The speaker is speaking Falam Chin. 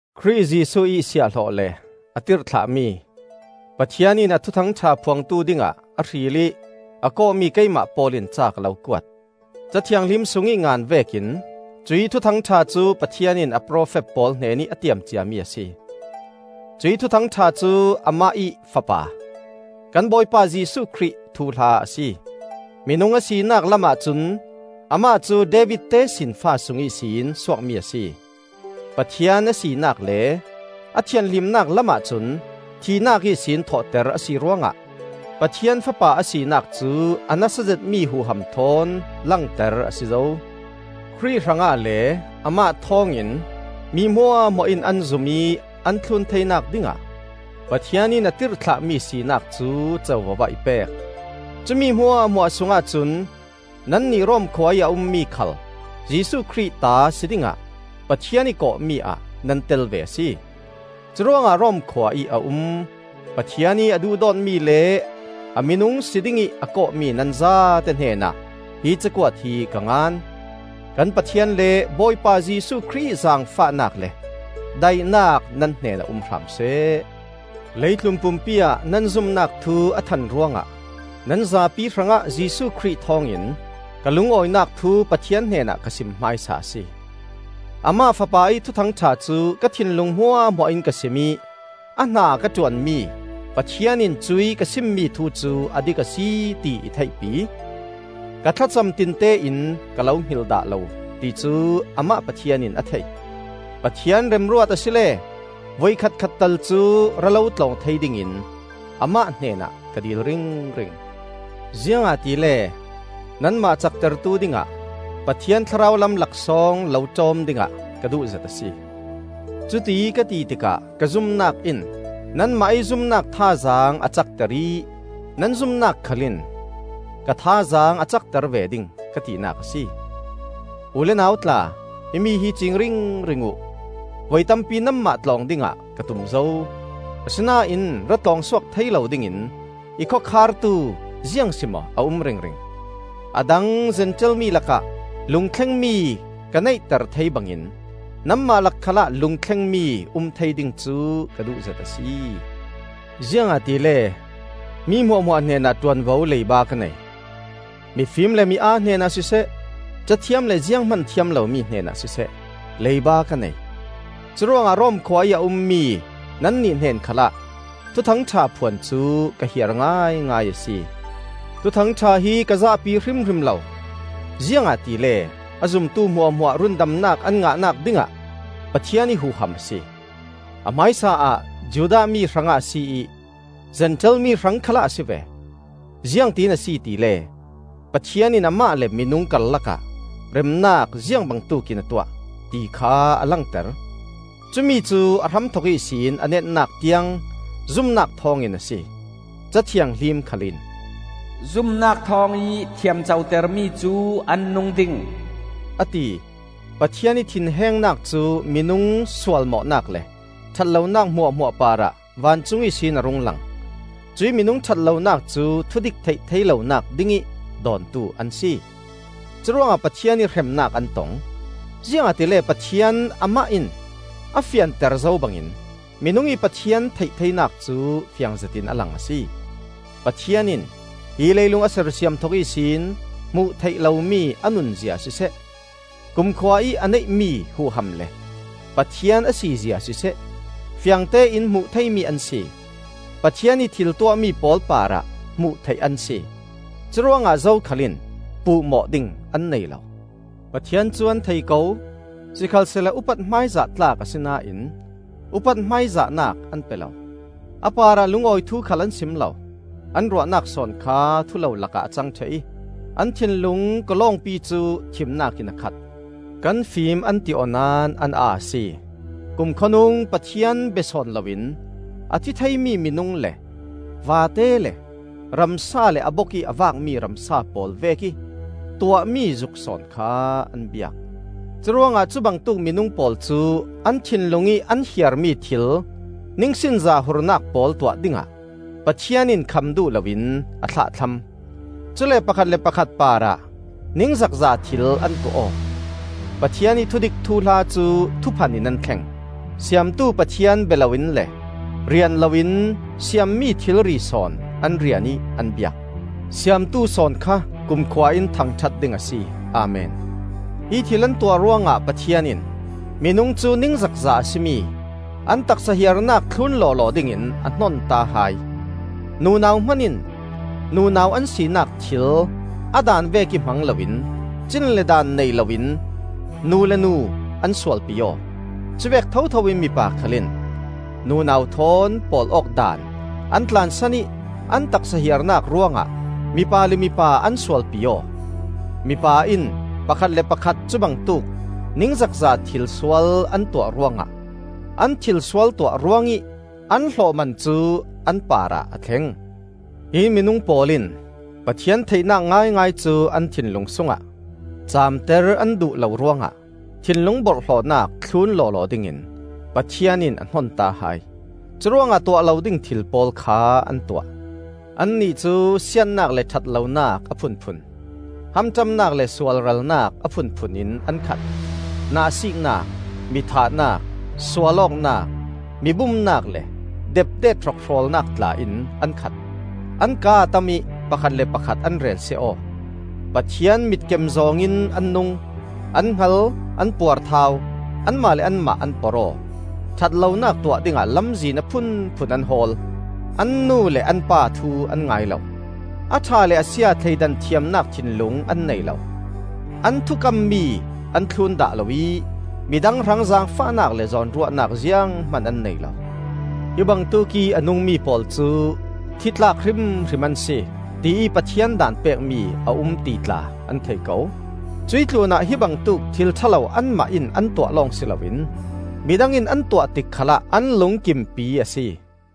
Khrih Jesuh ih siahhlawh le a tirhthlahmi, Pathian in a Thuthang ṭha phuangtu dingah a hril ih a kawhmi keimah Paul in ca ka lo kuat. Ca Thianghlim sungih ngan vekin cuih Thuthang ṭha cu Pathian in a profet pawl hnenih a tiam ciami a si. Cuih Thuthang ṭha cu Amah ih Fapa, kan Bawipa Jesuh Khrih thuhla a si: minung a sinak lamah cun amah cu David tesinfa sung ihsin suakmi a si. Pathian a sinak le a thianhlimnak lamah cun, thihnak ihsin thawhter a si ruangah Pathian Fapa a sinak cu a nasa zetmi huham thawn langter a si zo. Khrih hrangah le Amah thawngin mi hmuahhmuah in an zum ih an thlun theinak dingah Pathian in a tirhthlahmi sinak cu covo ah i pek. Cu mi hmuahhmuah sungah cun nannih Rom khua ih a ummi khal Jesuh Khrih ta si dingah Pathian ih kawhmi ah nan tel ve a si. Curuangah Rom khua ih a um, Pathian ih a duhdawtmi le a minung si dingih a kawhmi nan zate hnenah hi cakuat hi ka ngan. Kan Pathian le Bawipa Jesuh Khrih ih zaangfahnak le daihnak nan hnenah um hram seh. Leitlun pumpi ah nan zumnak thu a than ruangah nan zapi hrangah Jesuh Khrih thawngin ka lungawinak thu Pathian hnenah ka sim hmaisa a si. Amah Fapa ih Thuthang ṭha cu ka thinlung hmuahhmuah in ka sim ih a hna ka ṭuanmi Pathian in cuih ka simmi thu cu a dik a si ti i theihpi. Ka thlacam tinte in ka lo hngilh dah lo ti cu Amah Pathian in a thei. Pathian remruat asile voikhat khat tal cu ra lo tlawng thei dingin Amah hnenah ka dil ringring. Ziangahtile nanmah caktertu dingah Pathian thlarau lam laksawng lo ṭawm dingah ka duhzet a si. Cuti ka ti tikah ka zumnak in nanmah ih zumnak thazaang a cakter ih nan zumnak khal in ka thazaang a cakter ve ding ka tinak a si. U le nau tla, himi hi ciing ringring uh: voi tampi nanmah tlawng dingah ka tum zo; asinain ra tlawng suak thei lo dingin i khawkhartu ziangsimaw a um ringring. A dang Zentail mi lakah lungthlengmi ka neihter thei bangin nanmah lak khalah lungthlengmi um thei ding cu ka duhzet a si. Ziangahtile mi hmuahhmuah hnenah ṭuanvo leiba ka nei: mifim le mi-aa hnenah siseh, cathiam le zianghman thiam lomi hnenah siseh, leiba ka nei. Curuangah Rom khua ih a ummi nannih hnen khalah Thuthang ṭha phuan cu ka hiar ngaingai a si. Thuthang ṭha hi ka zahpi hrimhrim lo: ziangahtile a zumtu hmuahhmuah rundamnak an ngahnak dingah Pathian ih huham a si. A hmaisa ah Judah mi hrangah a si ih Zentail mi hrang khalah a si ve. Ziangtiin a si tile, Pathian in Amah le minung karlakah remnak ziang bangtuk in a tuah, ti kha a langter: cumi cu a hramthok ihsin a netnak tiang zumnak thawngin a si. Ca Thianghlim khalin, “Zumnak thawngih thiamcotermi cu an nung ding,” a ti. Pathian ih thinhengnak cu minung sualmawhnak le ṭhat lonak hmuahhmuah parah vancung ihsin a rung lang; cuih minung ṭhat lonak cu thudik theih thei lonak dingih dawntu an si. Curuangah Pathian ih hremnak an tong; ziangahtile Pathian Amah in a fianter zo bangin minung ih Pathian theih theinak cu fiang zetin a lang a si. Pathian in hi leilung a sersiam thok ihsin hmuh theih lomi a nunzia siseh, kumkhua ih a neihmi huham le Pathian a sizia siseh, fiangtein hmuh theimi an si. Pathian ih thil tuahmi pawl parah hmuh theih an si. Curuangah zokhal in puhmawh ding an nei lo. Pathian cu an thei ko; sikhalsehla upat hmaizah tlak asinain upat hmaizahnak an pe lo; a parah lungawi thu khal an sim lo. An ruahnak sawn kha thulolak ah a cang ṭheh ih an thinlung kawlawngpi cu thimnak in a khat. Kan fim an ti aw naón an aa a si. Kumkhawnung Pathian bia sawn loin a thi theimi minung le vate le ramsa le a bokih a vakmi ramsa pawl vekih tuahmi zuk sawn kha an biak. Curuangah cubangtuk minung pawl cu an thinlung ih an hiarmi thil ningsinza hurnak pawl tuah dingah Pathian in kham duh loin a thlahthlam. Cule pakhat le pakhat parah ningzakza thil an tuah aw. Pathian ih thudik thuhla cu thuphan in an thleng; Siamtu Pathian bia loin le rian loin siammi thilri sawn an rian ih an biak. Siamtu sawn kha kumkhua in thangṭhat ding a si. Amen. Hi thil an tuah ruangah Pathian in minung cu ningzakza a si mi an taksa hiarnak thlun lawlaw dingin a hnonta hai. Nunau hmanin nunau an sinak thil a daan vekih hmang loin cin le daan nei loin nu le nu an sualpi aw. Cuvek thotho in mipa khal in nunau thawn pawl awk daan an tlansan ih an taksa hiarnak ruangah mipa le mipa an sualpi aw. Mipa in pakhat le pakhat cubangtuk ningzakza thilsual an tuah ruangah an thilsual tuah ruangih an hlawhman cu an parah a thleng. Hi minung pawl in Pathian theihnak ngaingai cu an thinlung sungah caamter an duh lo ruangah thinlung borhhlawhnak thlun lawlaw dingin Pathian in a hnonta hai. Curuangah tuah lo ding thil pawl kha an tuah. Annih cu siatnak le ṭhat lonak a phunphun, hamṭamnak le sualralnak a phunphun in an khat; nahsiiknak, mithahnak, sualawknak, mi bumnak le depdet hrokhrawlnak tla in an khat. An kaa a tam ih, pakhat le pakhat an relsia aw. Pathian mitkem zawng in an nung, an hngal, an puarthau, anmah le anmah an porh aw, ṭhat lonak tuah dingah lamzin a phunphun an hawl, an nu le an pa thu an ngai lo; a ṭha le a sia thleidan thiamnak thinlung an nei lo, an thukam mi an thlun dah lo ih midang hrang zaangfahnak le zawnruahnak zianghman an nei lo. Hi bangtuk ih a nungmi pawl cu thi tlak hrimhrim an si, tiih Pathian daan pekmi a um ti tla an thei ko. Cuih tlunah hibangtuk thil ṭha lo anmah in an tuah lawng si loin midang in an tuah tik khalah an lungkimpi a si.